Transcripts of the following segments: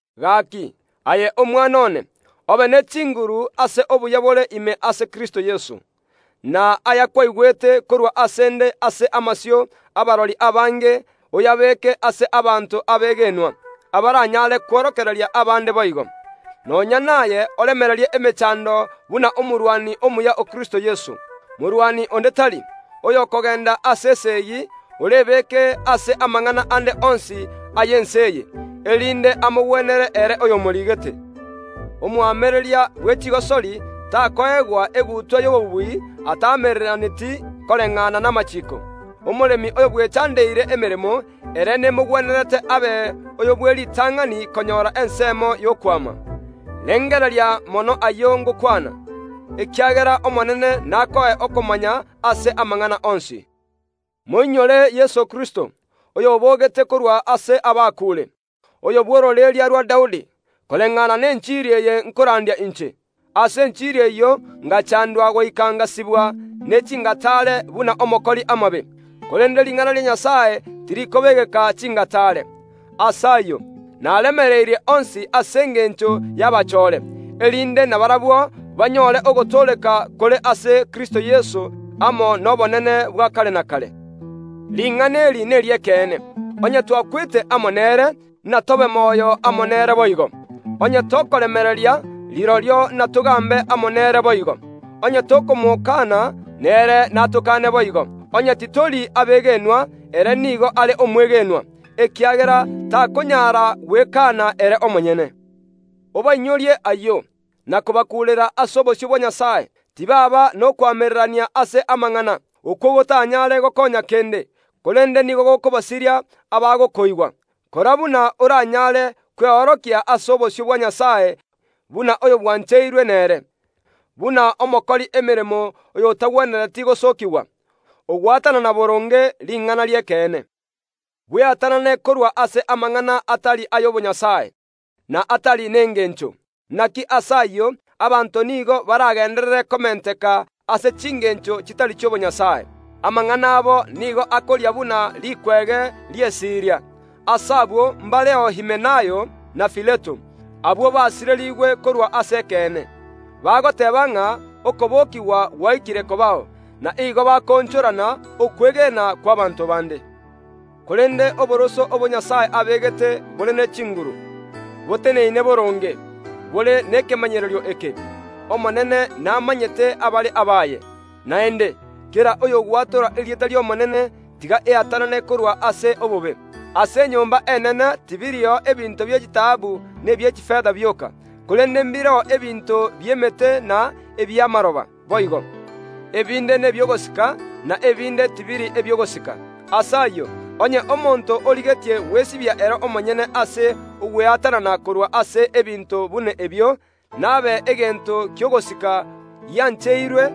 Gaaki, aye omwana one, obe ne chinguru ase obuya bore ime ase Kristo Yeso. Na ayakwaigwete korwa ase ’nde ase amasio y’abarori abange oyabeeke ase abanto abegenwa, abaranyare kworokereria abaande boigo. Nonya naye oremererie emechando buna omorwani omuya o Kristo Yeso. Morwani onde tari, oyokogeenda ase esegi, orebeke ase amang’ana ande onsi y’ense eye, erinde amogwenere ere oyomoriigete. Omoamereria bwe chigosori takoegwa egutwa y’obobui ataamereraneti koreng’ana namachiiko. Omoremi oyobwechandeire emeremo, ere nemogwenerete abe oyo bw’eritang’ani konyora ensemo y’okwama. Rengereria mono ayio ngokwana, ekiagera Omonene nakoe okomanya ase amang’ana onsi. Moinyore Yeso Kristo, oy’oboogete korwa ase abakuure, oyo bw’ororeria rwa Daudi, koreng’ana nenchiri eye nkorandia inche. Ase enchiri eyio ngachaandwa goika ngasibwa ne chingataare buna omokori amabe. Korende ring’ana ria Nyasae tirikobeegeka chingataare. Ase ayio naremereirie onsi ase engencho y’abachoore, erinde nabarabwo banyoore ogotooreka kore ase Kristo Yeso amo nobonene bwa kare na kare. Ring’ana eri neri’ekeene: Onye twakwete amo nere, inatobe moyo amo nere boigo. Onye tokoremereria, rirorio natogaambe amo nere boigo; onye tokomokaana, nere natokaane boigo; onye titori abegenwa, ere nigo are omwegenwa, ekiagera takonyara gwekaana ere omonyene. Obainyorie ayio, na kobakuurera ase obosio bwa Nyasae, tibaaba nokoamererania ase amang’ana, okwo gotanyaare gokoonya kende, korende nigo gokobasiria abagokoigwa. Kora buna oranyaare kweorokia ase obosio bwa Nyasae buna oyobwancheirwe nere, buna omokori emeremo oyotagwenereti gosookigwa, ogwatanana boronge ring’ana ri’ekeene. Bweatanane korwa ase amang’ana atari y’obonyasae, na atari nengeencho. Inaki ase ayio abanto nigo barageenderere komenteka ase chingeencho chitari chi’obonyasae. Amang’ana abo nigo akoria buna rikwege ri’esiria. Ase abwo mbareo Himenayo na Fileto. Abwo basireriigwe korwa ase ekeene, bagoteeba ng’a okobokigwa gwaikire kobao, na igo bakoonchorana okwegena kw’abaanto baande. Korende oboroso obo Nyasae abeegete bore ne chinguru, boteneine boronge, bore nekemanyererio eke: “Omonene namanyete abare abaye”, naende, “Kera oyogwatora erieta ri’Omonene, tiga eatanane korwa ase obobe.” Ase enyomba enene tibirio ebinto bie chitaabu na ebie chifeta bioka, korende mbireo ebinto bi’emete na ebi’amaroba boigo; ebinde nebi’ogosika, na ebinde tibiri ebi’ogosika. Ase ayio, onye omonto origetie gwesibia ere omonyene ase ogweatanana korwa ase ebinto buna ebio, nabe egento ki’ogosika, giancheirwe,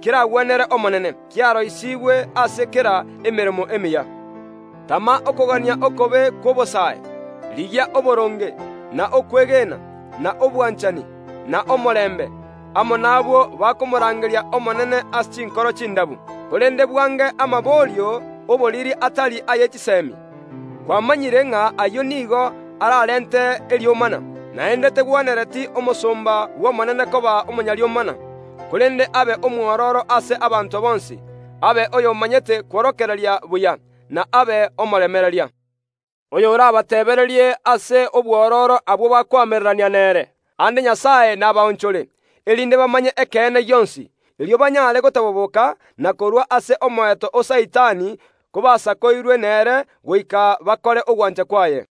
keragwenere Omonene, kiaroisiigwe ase kera emeremo emiya. Tama okogania okobe kw’obosae, rigia oboronge, na okwegena, na obwanchani, na omorembe, amo nabwo bakomorangeri’Omonene ase chinkoro chindabu. Korende bwange amaborio y’oboriri atari aye chiseemi. Kwamanyire ng’a ayio nigo ararente eriomana. Naende tegwenereti omosomba Omonene koba omonyariomana, korende abe omwororo ase abanto bonsi, abe oy’omanyete kworokereria buya, na abe omoremereria, oyorabateebererie ase obwororo abwo bakoamererania nere. Aande Nyasae nabaonchore, erinde bamanye ekeene gionsi, erio banyare gotaboboka na korua ase omoeto o Saitani kobasakoirwe nere goika bakore ogwancha kwaye.